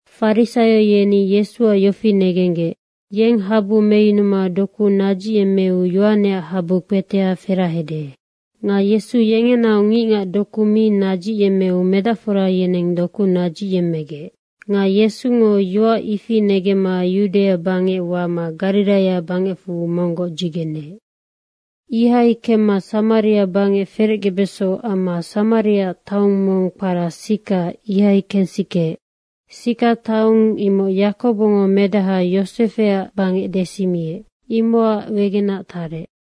Farisaio yeni Yesuac yofi negenggec, “Yeng habu meyunuma doku nadzicyemmeu Yohaneac habu kpetea ferahede.” Nga Yesu yengenaoc ngicngac doku mi nadzicyemmeu medacfora yeneng doku nadzicyemmegec. Nga Yesungo yoac ifi negemma Yudaia bangec wama Gariraia bangecfu monggoc dzigeneec. Ihai kemma Samaria bangec ferecgebeso amma Samariaac taong mong kpara Sika, ihai kensikeec. Sika taong imoc Yakobongo medaha Yosefeac bangec desimiec, imocac wegenac tarec.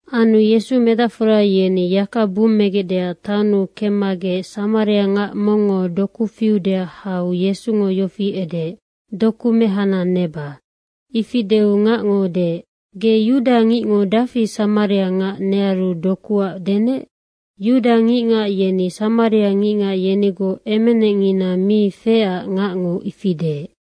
Anu medacfora yeni yaka bummegecdeac taonnu kemmagec samariangac mongngo doku fiudeac hau Yesungo yofi edeec, “Doku mehana neba.” Ifi deu ngacngo deec, “Ge yudangicngo dafi samariangac nearu dokuac denec?” Yudangicngac yeni samariangicngac yenigoc emenecngina mi feecac ngacngo ifi deec.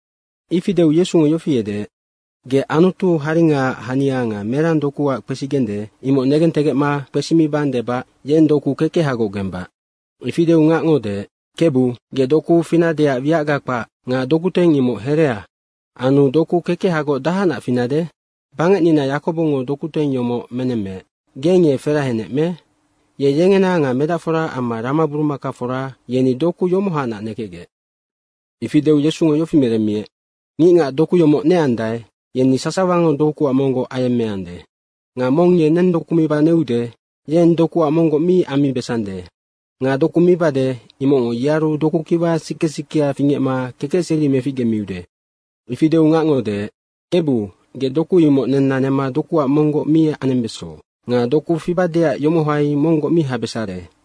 Ifi deu Yesungo yofi edeec, “Ge Anutu haringaac hania nga merang dokuac kpesigende, imoc negentegecma kpesimibang debac yeng doku kekehagoc gembac.” Ifi deu ngacngo deec, “Kebu, ge doku finadeac wiacga kpac nga dokuteng imoc herea anu doku kekehagoc dahacnac finade? Bangecnina Yakobongo dokuteng yomoc menemmeec. Geng ye ferahenec me? Ye yengena nga medacfora amma ramaburumakafora, yeni doku yomohanac nekecgec.” Ifi deu Yesungo yofi meremmiec, “Ngicngac doku yomoc neandae, yeni sasawango dokuac monggoc ayemmeande. Nga mong ye neng doku miba neude, yeng dokuac monggoc mi ammibesande. Nga doku mibade, imocngo yearu dokukiwa sike sikea fingecma kekecseri meficgemiude.” Ifi deu ngacngo deec, “Kebu, ge doku imoc nenna nema dokuac monggoc mi anembeso nga doku fibadeac yomohai monggoc mi habesare.”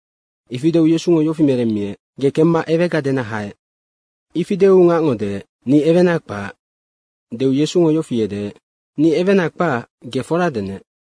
Ifi deu Yesungo yofi meremmiec, “Ge kemma ewega dena haec.” Ifi deu ngacngo deec, “Ni ewena kpac.” deu Yesungo yofi edeec, “Ni ewena kpac, ge fora denec.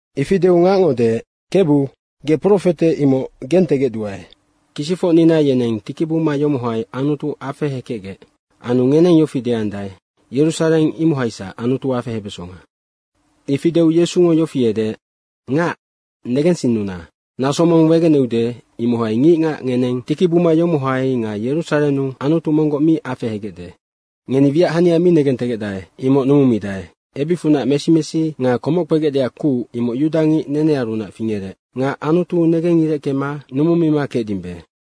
Ifi deu ngacngo deec, “Kebu, ge profete, imoc gentegecduae. Kisicfocnina yeneng tikibuma yomohai Anutu afehekecgec. Anu ngeneng yofi deandae, ‘Yerusareng, imohaisac Anutu afehebesonga.’” Ifi deu Yesungo yofi edeec, “Ngac negensinnuna, naso mong wegeneude, imohai ngicngac ngeneng tikibuma yomohai nga Yerusarennu Anutu monggoc mi afehegecde. Ngeni wiac hania mi negentegecdae, imoc numumidae. Ebicfunac mesi mesi nga komoc kpegecdeac kuc, imoc yudangic nenearunac fingerec nga Anutu negengireckema numumima kecdimbe.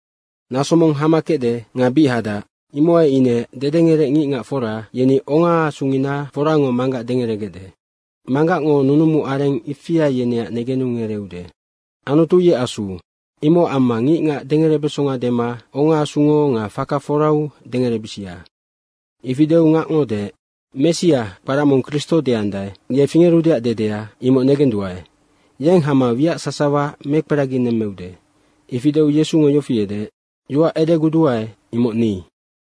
Naso mong hama kecde nga bic hadac, imohai ine dedengerec ngicngac fora, yeni ongaasungina forango Manggac dengeregecde. Manggacngo nunumu areng ifia yeneac negenu ngereeude. Anutu ye Asu. Imocac amma ngicngac dengerebesonga dema ongaasungo nga faka forau dengerebisia.” Ifi deu ngacngo deec, “Messia, kpara mong Kristo deandae, ye fingerudeac dedea, imoc negenduae. Yeng hama wiac sasawa dekperaginemmeude.” Ifi deu Yesungo yofi edeec, “Yoac edeguduae, imoc ni.”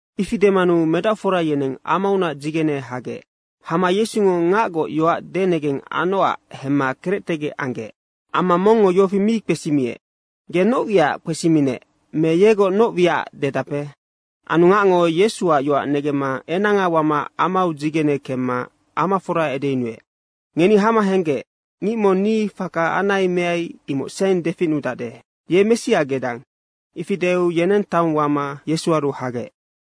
Ifi demanu medacfora yeneng amaunac dzigene hagec. Hama Yesungo ngacgoc yoac denegeng anocac hemma kerectegec anggec. Amma mongngo yofi mi kpesimiec, “Ge noc wiacac kpesiminec me yegoc noc wiacac dedape?” Anu ngacngo Yesuac yoac negemma enanga wama amau dzigene kemma amafora edeyunuec, “Ngeni hama henggec. Ngic mong ni faka anai meai, imoc seng deficnudacde. Ye Messia gedang?” Ifi deu yeneng taong wama Yesuaru hagec.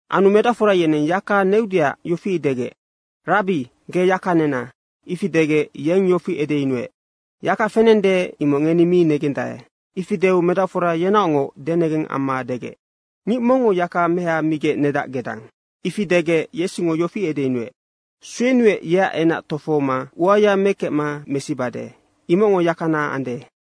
Anu medacfora yeneng yaka neudeac yofi degec, “Rabbi, ge yaka nena.” Ifi degec yeng yofi edeyunuec, “Yaka fenende, imoc ngeni mi negendae.” Ifi deu medacfora yenaocngoc denegeng amma degec, “Ngic mongngo yaka meha migec nedac gedang.” Ifi degec Yesungo yofi edeyunuec, “Suenuec, yeac enac tofohoma uaya mekecma mesibade, imocngo yakana ande.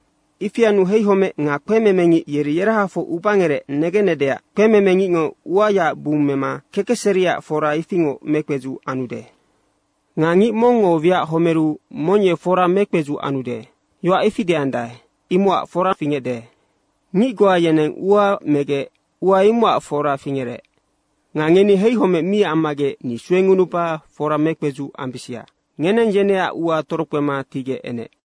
Ifi anu heihomec nga kpememengic yeri yerahafoc ubangerec negenecdeac kpememengicngo uayaac bung mema kekecseriac fora ifingoc mekpedzuc anude. Nga, ‘Ngic mongngo wiac homeru mong ye fora mekpedzuc anude.’ yoac ifi deandae, imocac foranoc fingecde. Ngic goa yeneng ua megec ua imocac fora fingerec. Nga ngeni heihomec mi ammagec ni suengunuba fora mekpedzuc ambisia. Ngeneng yeneac ua torokpema tigec enec.”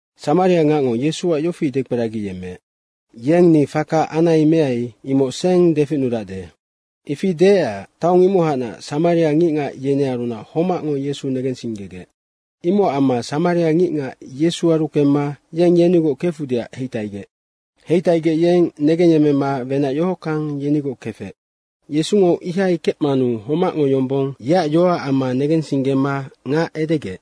Samariangacngo Yesuac yofi dekperagiyemmeec, “Yeng ni faka anai meai, imoc seng deficnudacde.” ifi deecac taong imohacnac samaria ngicngac yenearunac homacngo Yesu negensinggegec. Imocac amma samariangicngac Yesuaru kemma yeng yenigoc kefudeac heitaigec. Heitaigec yeng negengyemmema wenac yohockang yenigoc kefec. Yesungo ihai kecmanu homacngo yombong yeac yoacac amma negensinggema ngac edegec,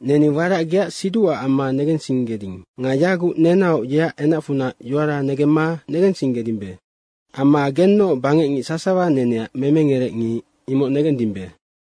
“Neni warac geac siducac amma negensinggeding. Nga yaguc nenaoc yeac enacfunac yoara negemma negensinggedimbe. Amma gennoc bangecngic sasawa neneac memengerec ngic, imoc negendimbe.”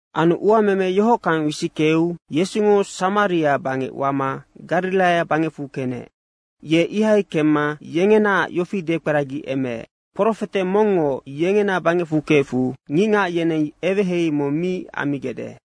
Anu uameme yohockang wisickeu Yesungo Samaria bangec wama Gariraia bangecfu kenec. Ye ihai kemma yengenaac yofi dekperagiemeec, “Profete mongngo yengena bangecfu kefu ngicngac yeneng eweheihei mong mi ammigecde.”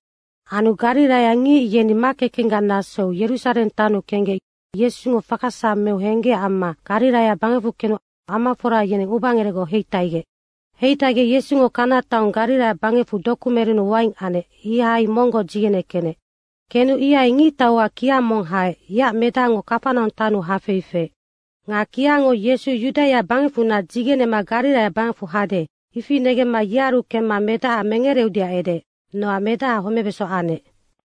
Anu gariraiangic yeni makekenggac nasou Yerusareng taonnu kenggec Yesungo faka sasawa meu henggecac amma Gariraia bangecfu kenu amafora yeneng ubangerecgoc heitaigec. Heitaigec Yesungo Kana taong Gariraia bangecfu doku merennu waing anec, ihai monggoc dzigene kenec. Kenu ihai ngictauac kia mong haec, yeac medacngo Kafanaung taonnu hafei feec. Nga kiango Yesu Yudaia bangecfunac dzigenema Gariraia bangecfu hade, ifi negemma yearu kemma medaha mengereudeac edeec, nocac medaha homebeso anec.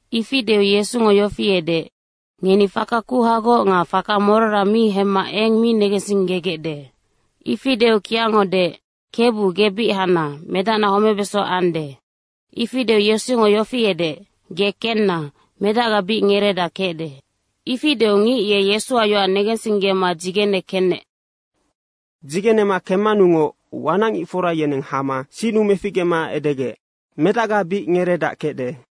Ifi deu Yesungo yofi edeec, “Ngeni faka kuhagoc nga faka morora mi hemma eng mi negensinggegecde.” Ifi deu kiango deec, “Kebu, ge bic hana, medacna homebeso ande.” Ifi deu Yesungo yofi edeec, “Ge kenna, Medacga bic ngereedac kecde.” ifi deu ngic ye Yesuac yoac negensinggema dzigene kenec. Dzigene kememanungoc wanacngicfora yeneng hama sinnu meficgema edegec, “Medacga bic ngereedac kecde.”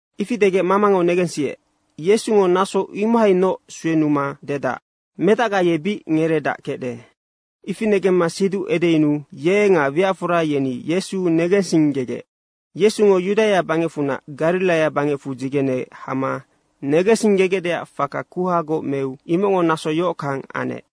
Ifi degec mamango negensiec, “Yesungo naso imohainoc suenuma dedac, ‘Medacga ye bic ngereedac kecde.’” Ifi negemma siduc edeyunuu ye nga wiacfora yeni Yesu negensinggegec. Yesungo Yudaia bangecfunac Gariraia bangecfu dzigene hama negensinggegecdeac faka kuhagoc meu imocngo naso yohockang anec.